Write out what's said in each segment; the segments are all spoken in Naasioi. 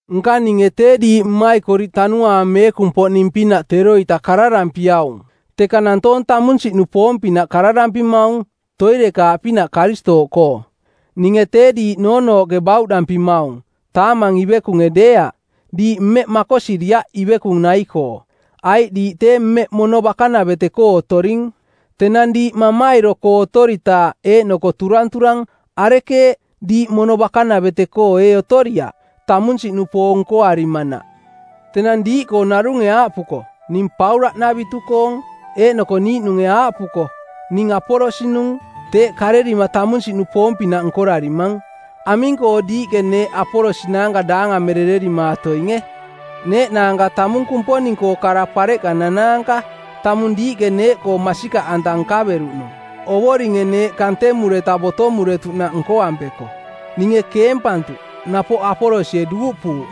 Nka ninge tee diiꞌ mmaikoriꞌ Tanuaang Meekung-poꞌning-pinaꞌ teroita kararampiaung, teka nantoong tamunsiꞌnupoong-pinaꞌ kararampimaung, toirekaaꞌpinaꞌ Karistooꞌkoo. Ninge tee diiꞌ noonooꞌke bauꞌdampimaung, taamang ivekunge deeaꞌ. Diiꞌ mmeꞌ makosiriaꞌ ivekung nai-koo, aiꞌ diiꞌ tee mmeꞌ mono bakanavete-koo otoring. Tenang diiꞌ mamairo-koo otoritaaꞌ eeꞌnoko turanturang, arekeeꞌ, diiꞌ mono bakanavete-koo ee otoriaꞌ, tamunsiꞌnupoong nkoarimanaꞌ? Tenang diiꞌkoo narunge aaꞌpuko, “Ning Paulaꞌnavitu-koong,” eeꞌnoko niiꞌnunge aaꞌpuko, “Ning Apolos-nung,” teeꞌ karerima tamunsiꞌnupoong-pinaꞌ nkorarimang. Aming-koo diiꞌke neeꞌ Apolos naanka daangamerererimaatoinge? Neeꞌnaanka tamung Kumponing-koo kara-pareꞌka nanaanka, tamung diiꞌke neeꞌkoo masikaꞌanta nkaveruꞌnung, Ovoringe neeꞌ kantemureta botomuretuꞌnaꞌ nkoampeko. Ninge keempantuꞌ, napoꞌ Apolosie duuꞌpuuꞌ,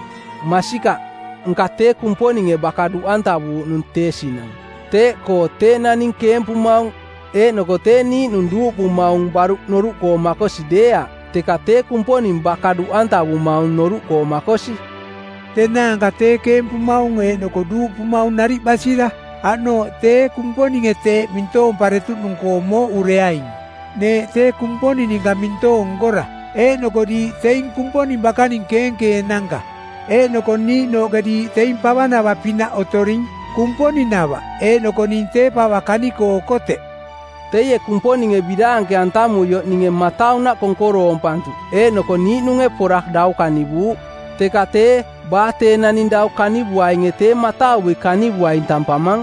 masikaꞌ, nka tee Kumponinge baka duꞌantavuuꞌnung tee sinang. Teeꞌkoo tee naning keempumaung eeꞌnoko tee niiꞌnung duuꞌpumaung baruꞌ noruꞌkoo makosi deeaꞌ, teka tee Kumponing baka duꞌantavumaung noruꞌkoo makosi. Tenaanka tee, keempumaung eeꞌnoko duuꞌpumaung nariꞌ basira; aꞌnooꞌ tee Kumponinge teeꞌ mintoomparetuꞌnung-koo mooꞌureaing. Neeꞌ tee Kumponing ninka mintoong nkora, eeꞌnoko diiꞌ teing Kumponing bakaning keenkeenanka. Eeꞌnoko niiꞌnooꞌke diiꞌ teing pavanava-pinaꞌ otoring, Kumponing-nava, eeꞌnoko ning tee pava kani-koo okoteꞌ. Teie Kumponinge biraanke-antamuioꞌ ninge mataunaꞌ konkoroompantuꞌ eeꞌnoko niiꞌnunge pora dau kanivuuꞌ. Teka tee baa tee naning dau kanivuainge tee matauvui kanivuaing tampamang.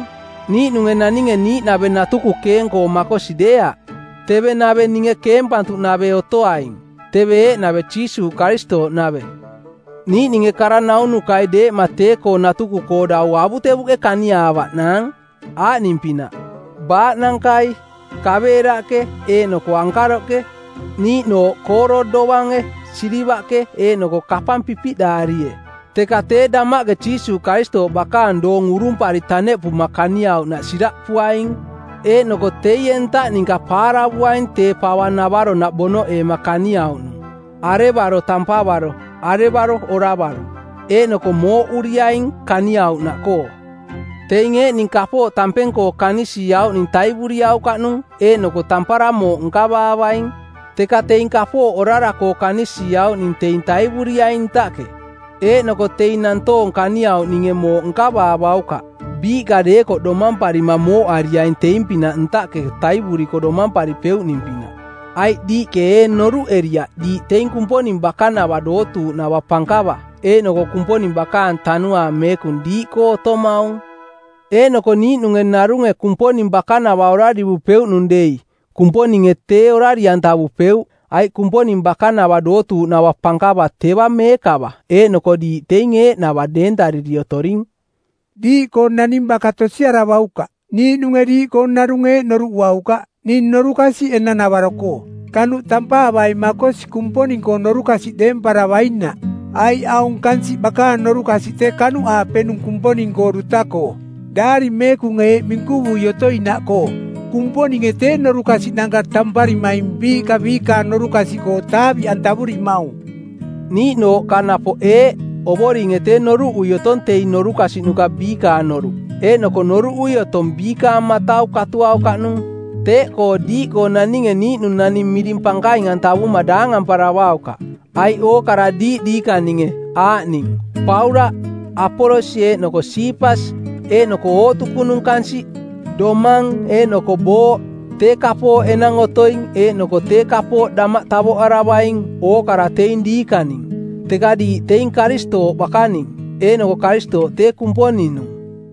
Niiꞌnunge naninge niiꞌnave natuku keeng-koo makosi deeaꞌ. Teve nave ninge keempantuꞌnave otoaing. Teve eeꞌnave Jiisuuꞌ Karistooꞌnave. Niiꞌninge kara-naunukai deeꞌma tee-koo natuku-koo dau avutevuꞌke kaniaavaꞌnaang, aaꞌning-pinaꞌ: baaꞌnankai, kaveeraꞌke eeꞌnoko ankaroꞌke; niiꞌnooꞌ kooro dovange, silivaꞌke eeꞌnoko kapang pipiꞌdaarie. Teka tee damaꞌke Jiisuuꞌ Karistooꞌ bakaang doong urumpari taneꞌpuma kaniauꞌnaꞌ siraꞌpuaing, eeꞌnoko teie ntaꞌ ninka paaravuaing tee pava navaronaꞌ bonoꞌeema kaniauꞌnung, arevaro tampavaro, arevaro oravaro. Eeꞌnoko mooꞌuriaing kaniauꞌnaꞌkoo. Teing eeꞌning kapooꞌ tampeng-koo kanisiiauꞌning taivuriaukaꞌnung eeꞌnoko tampara mooꞌ nkavaavaing. Teka teing kapooꞌ orara-koo kanisiiauꞌning teing taivuriaining ntaꞌke, eeꞌnoko teing nantoong kaniauꞌninge mooꞌ nkavaavaukaꞌ, biiꞌka deekoꞌ domamparima mooꞌariaing teing-pinaꞌ ntaꞌke taivuriko domamparipeuꞌning-pinaꞌ. Aiꞌ diiꞌke ee noruꞌeriaꞌ diiꞌ teing Kumponing bakanava dootuuꞌnava pankava eeꞌnoko Kumponing bakaang Tanuaang Meekung diiꞌkoo otomaung? Eeꞌnoko niiꞌnunge narunge Kumponing bakanava orarivupeuꞌnung dei Kumponinge tee orari-antavupeuꞌ, aiꞌ Kumponing bakanava dootuuꞌnava pankava teva meekava eeꞌnoko diiꞌ teing eeꞌnava deentariri otoring. Diiꞌkoo naning baka tosiaravaukaꞌ. Niiꞌnunge diiꞌkoo narunge eeꞌ noruꞌuaukaꞌ: “Ning norukasiꞌ enang-navaro-koo.” Kanuꞌ tampaavai makosi Kumponing-koo norukasiꞌ deemparavainaꞌ. Aiꞌ aung kansiꞌ bakaang norukasiꞌ tee kanuꞌaapenung Kumponing-koo duta-koo. Daari Meekunge eeꞌ minkuvui otoinaꞌkoo, “Kumponinge tee norukasiꞌnanka tamparimaing biiꞌka biikaang norukasiꞌkoo taaviꞌantavurimaung.” Niiꞌnooꞌkoo napoꞌ eeꞌ, “Ovoringe tee noruꞌui otong teing norukasiꞌnuka biikaang noruꞌ, eeꞌnoko noruꞌui otong biikaang matau katuaukaꞌnung.” Teeꞌkoo diiꞌkoo naninge niiꞌnung naning miring pankaing-antavuma daangamparavaukaꞌ. Aiꞌ ookara diiꞌ diikaninge, aaꞌning: Paulaꞌ, Apolos eeꞌnoko Siipas, eeꞌnoko ootukunung kansiꞌ, domang eeꞌnoko booꞌ, tee kapooꞌ enang otoing eeꞌnoko tee kapooꞌ damaꞌ tavoꞌaravaing – ookara teing diikaning. Teka diiꞌ teing Karistooꞌ bakaning, eeꞌnoko Karistooꞌ tee Kumponing-nung.